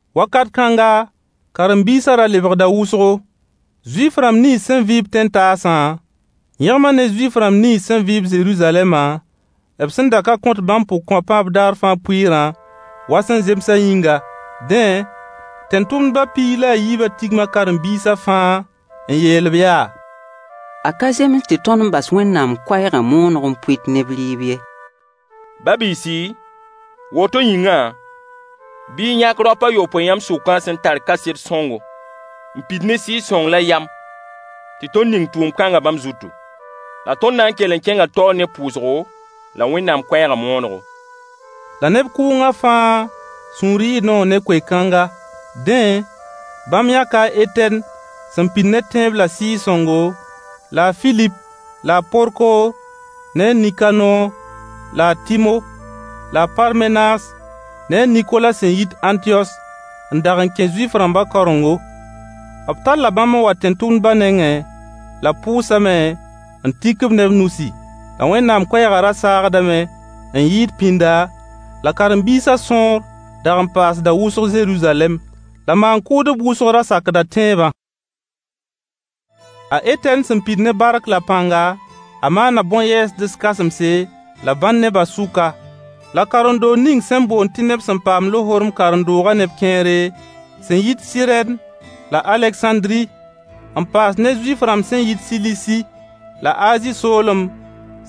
Wakat kãnga, karen-biisã ra lebgda wʋsgo. Zuif-rãmb nins sẽn vɩ-b tẽn-taasã yẽgma ne Zuif-rãmb nins sẽn vɩ-b Zeruzalɛma, b sẽn da ka kõt bãmb pʋgkõapã b daar fãa pʋɩɩrã wa sẽn zemsã yĩnga. Dẽ, tẽn-tʋmdba piig la a yiibã tigma karen-biisa fãa n yeel-b yaa: A ka zems tɩ tõnd bas Wẽnnaam koɛɛgã mooneg n pʋɩt neb rɩɩb ye. Ba-biisi, woto yĩngã, bɩ y yãk raop a yopoe yãmb sʋkã sẽn tar kaset sõngo, n pid ne Sɩɩg-sõng la yam, tɩ tõnd ning tʋʋm-kãngã bãmb zutu. La tõnd na n kell n kẽnga taoor ne pʋʋsgo la Wẽnnaam koɛɛgã moonego. La neb kʋʋngã fãa sũur yɩɩ noog ne koe-kãnga. Dẽ, bãmb yãka a Etɛn sẽn pid ne tẽeb la Sɩɩg-sõngo la a Filip la a Porkoor la a Nikanoor la a Tɩmo la a Parmenaas ne a Nikola sẽn yit Ãntiyos n dag n kẽ Zuif-rãmba kaorengo. B talla bãmb n wa tẽn-tʋmdba nengẽ la b pʋʋsame n tik-b ne b nusi. La Wẽnnaam koɛɛgã ra saagdame n yɩɩd pĩnda, la karen-biisã sõor dag n paasda wʋsg Zeruzalɛm. La maan-kʋʋdb wʋsg ra sakda tẽebã. A Etɛn sẽn pid ne bark la pãnga, a maana bõn-yɛɛsds kãsemse la bãn neba sʋka. La karen-doog ning sẽn boond tɩ neb sẽn paam lohorem karen-doogã neb kẽere sẽn yit Sɩrɛn la Alegsãndri n paas ne Zuif-rãmb sẽn yit Silisi la Azi soolem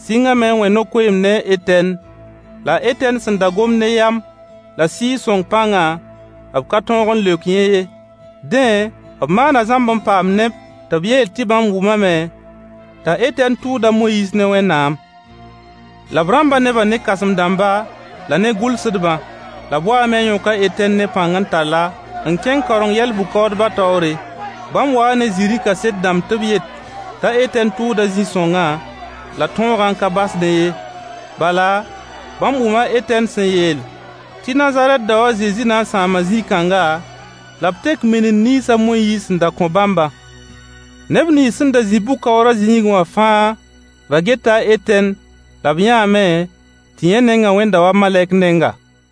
sɩngame n wẽ no-koeemd ne a Etɛn. La a Etɛn sẽn da gomd ne yam la sɩɩg-sõng pãngã,b ka tõog n leok yẽ ye. Dẽ, b maana Zãmb n paam neb tɩ b yeel tɩ bãmb wʋmame t'a Etɛn tʋʋd a Moyiis ne Wẽnnaam. La b rãmba nebã ne kãsem-dãmba la ne gʋlsdbã. La b waame n yõk a Etɛn ne pãng n tall-a n kẽng Kaoreng-yɛl-bʋ-kaoodbã taoore. Bãmb waa ne zĩri kaset dãmb tɩ b yet t'a Etɛn tʋʋda zĩ-sõngã la tõogã n ka basdẽ ye. Bala, bãmb wʋma a Etɛn sẽn yeel tɩ Nazarɛt dao a Zezi na n sãama zĩ-kãnga la b tek minind nins a Moyiis sẽn da kõ bãmbã. Neb nins sẽn da zĩ bʋ-kaoorã zĩigẽ wã fãa ra geta a Etɛn la b yãame tɩ yẽ nengã wẽnda wa malɛk nenga.